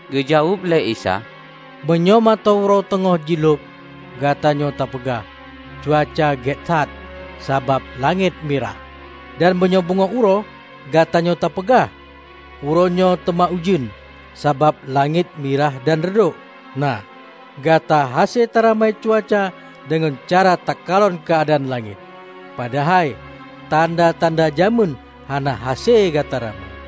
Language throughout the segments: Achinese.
Geujaweueb lé Isa, ("Meunyoe mata uroe teungoh jilhob, gatanyoe tapeugah, 'Cuaca gét that, sabab langét mirah.' Dan meunyoe beungoh uroe, gatanyoe tapeugah, 'Uroe nyoe teuma ujeuen, sabab langét mirah dan reudok.' Nah, gata hase taramai cuaca deungon cara takalon keuadaan langét, padahai, tanda-tanda jamén hana hase gata ramai!")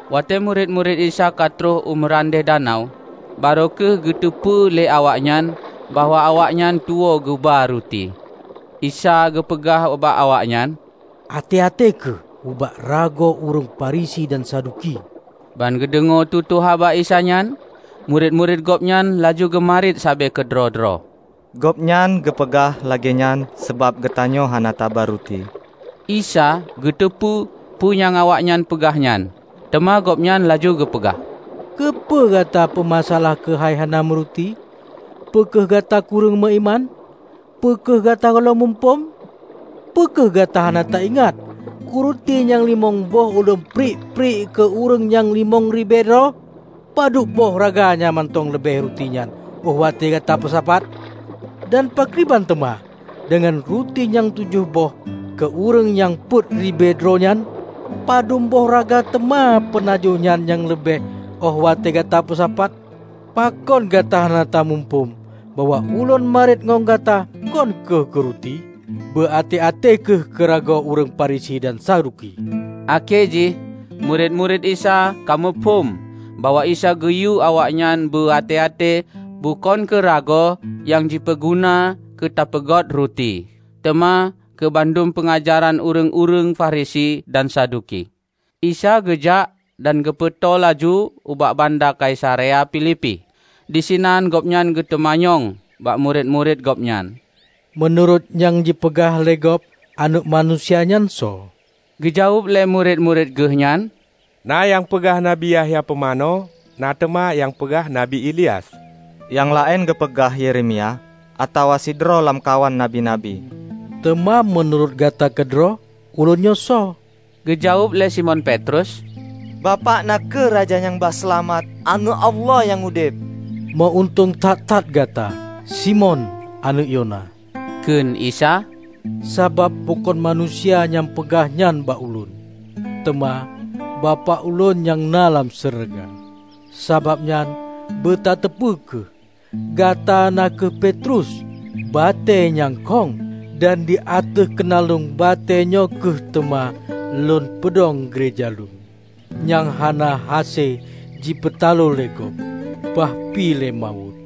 Watée murit-murit Isa ka trok u meurandeh danau, barô kheueh geuteupeue lé awaknyan bahwa awaknyan tuwoe geuba ruti. Isa geupeugah ubak awaknyan, "Até-até kheueh ubak ragoe ureuëng Farisi dan Saduki." Ban geudeungoe tutoe haba Isa nyan, murit-murit Gobnyan laju geumariet sabe keudroe-droe, "Gobnyan geupeugah lagée nyan sabab geutanyoe hana taba ruti." Isa geuteupeue peue nyang awaknyan peugah nyan. Teuma Gobnyan laju geupeugah, "Keupeue gata peumasa-alah keuhai hana meuruti? Peu kheueh gata kureueng meuiman! Peu kheueh gata gohlom muphom? Peu kheueh gata hana ta-ingat keu ruti nyang limong boh Ulôn priek-priek keu ureuëng nyang limong ribée droe? Padub boh raga nyang mantong leubeh ruti nyan óh watée gata peusapat? Dan pakriban teuma deungon ruti nyang tujoh boh keu ureuëng nyang peuet ribée droe nyan? Padub boh raga teuma peunajoh nyan nyang leubeh óh watée gata peusapat? Pakon gata hana tamuphom bahwa Ulôn mariet ngon gata kon kheueh keu ruti? Beu até-até kheueh keu ragoe ureuëng Farisi dan Saduki!" Akhé jih murit-murit Isa ka muphom bahwa Isa geuyue awaknyan beu até-até bukon keu ragoe nyang jipeuguna keu teupeugöt ruti, teuma keu bandum peungajaran ureuëng-ureuëng Farisi dan Saduki. Isa geujak dan geupeutô laju ubak banda Kaisarea Filipi. Disinan Gobnyan geuteumanyong bak murit-murit Gobnyan, "Meunurot nyang jipeugah lé gob, Aneuëk Manusia nyan soe?" Geujaweueb lé murit-murit Geuh nyan, "Na nyang peugah Nabi Yahya Pumanö. Na teuma nyang peugah Nabi Ilyas. Nyang laén geupeugah Yeremia, atawa sidroe lamkawan nabi-nabi." "Teuma meunurot gata keudroe, Ulôn nyoe soe?" Geujaweueb lé Simon Petrus, "Bapak na kheueh Raja Nyang ba Seulamat, Aneuëk Allah Nyang Udeb." "Meu-untông that-that gata, Simon, aneuëk Yona!" Kheun Isa, "Sabab bukon manusia nyang peugah nyan ubak Ulôn, teuma Bapak Ulôn nyang na lam syeuruga. Sabab nyan beu tateupeue kheueh, gata na kheueh Petrus, batée nyang khong. Dan di ateueh keunaleueng batée nyoe kheueh teuma Lôn peudong geureja Lôn, nyang hana hase jipeutaloe lé gob; bah pih lé mawöt!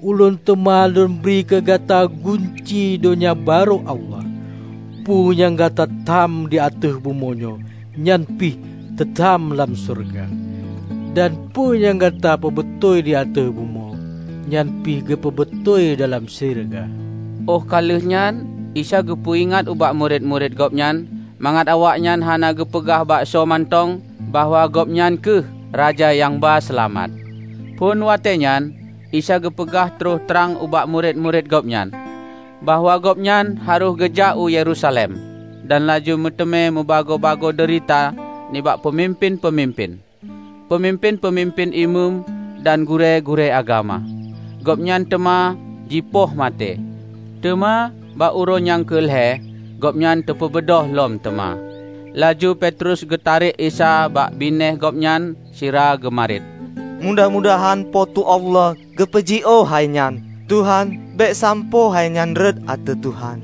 Ulôn teuma Lôn bri keu gata gunci Donya Barô Allah. Peue nyang gata tham di ateueh bumoe nyoe, nyan pih teu tham lam syeuruga. Dan peue nyang gata peubeutôi di ateueh bumoe, nyan pih geupeubeutôi dalam syeuruga." Óh ka lheueh nyan Isa geupeu-ingat ubak murit-murit Gobnyan mangat awaknyan hana geupeugah bak soe mantong bahwa Gobnyan kheueh Raja nyang ba Seulamat. Phon watée nyan, Isa geupeugah troh trang ubak murit-murit Gobnyan, bahwa Gobnyan harôh geujak u Yerusalem dan laju meuteumé meubagoe-bagoe deurita nibak peumimpén-peumimpén, peumimpén-peumimpén Imeum dan gurée-gurée agama. Gobnyan teuma jipoh maté, teuma bak uroe nyang keu lhée Gobnyan teupeubeudôh lom teuma. Laju Petrus geutarek Isa bak binéh Gobnyan sira geumariet, "Mudah-mudahan Po teu Allah geupeujiôh hai nyan. Tuhan, bék sampoe hainyan rhot ateueh Tuhan!"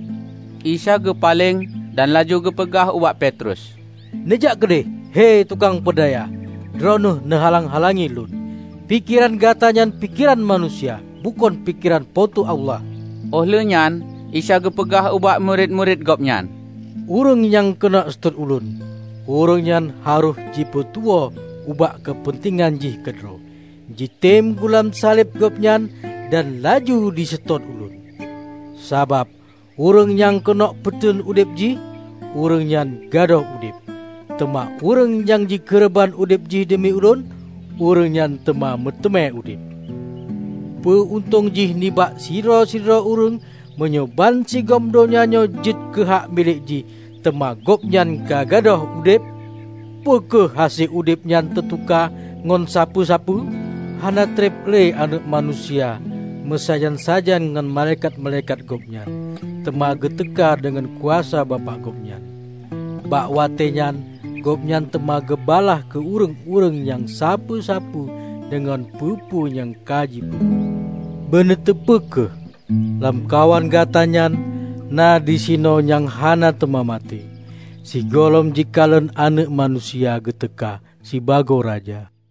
Isa geupaleng dan laju geupeugah ubak Petrus, "Neujak keudeh, he tukang peudaya! Droeneueh neuhalang-halangi lôn. Pikeran gata nyan pikeran manusia; bukon pikeran Po teu Allah!" Óh lheueh nyan Isa geupeugah ubak murit-murit Gobnyan, "Ureuëng nyang keuneuk seutôt Ulôn, ureuëng nyan harôh jipeutuwoe ubak keupeuntengan jih keudroe, jitem gulam saleb Gobnyan, dan laju jiseutôt Ulôn. Sabab ureuëng nyang keuneuk peuteuen udeb jih, ureuëng nyan gadôh udeb. Teuma ureuëng nyang jikeureubeuen udeb jih deumi Ulôn, ureuëng nyan teuma meuteumé udeb. Peue untông jih nibak sidroe-droe ureuëng, meunyoe bansigom donya nyoe jeuet keuhak milék jih teuma gobnyan ka gadôh udeb? Peu kheueh hase udeb nyan teutuka ngon sapeue-sapeue? Hana treb le Aneuëk Manusia meusajan-sajan ngon malaikat-malaikat Gobnyan teuma geuteuka deungon kuasa Bapak Gobnyan. Bak watée nyan Gobnyan teuma geubalaih keu ureuëng-ureuëng nyang sapeue-sapeue deungon peue-peue nyang ka jipeubuet. Beuneuteupeu kheueh! Lamkawan gata nyan na disinoe nyang hana teuma maté, sigohlom jikalon Aneuëk Manusia geuteuka sibagoe Raja."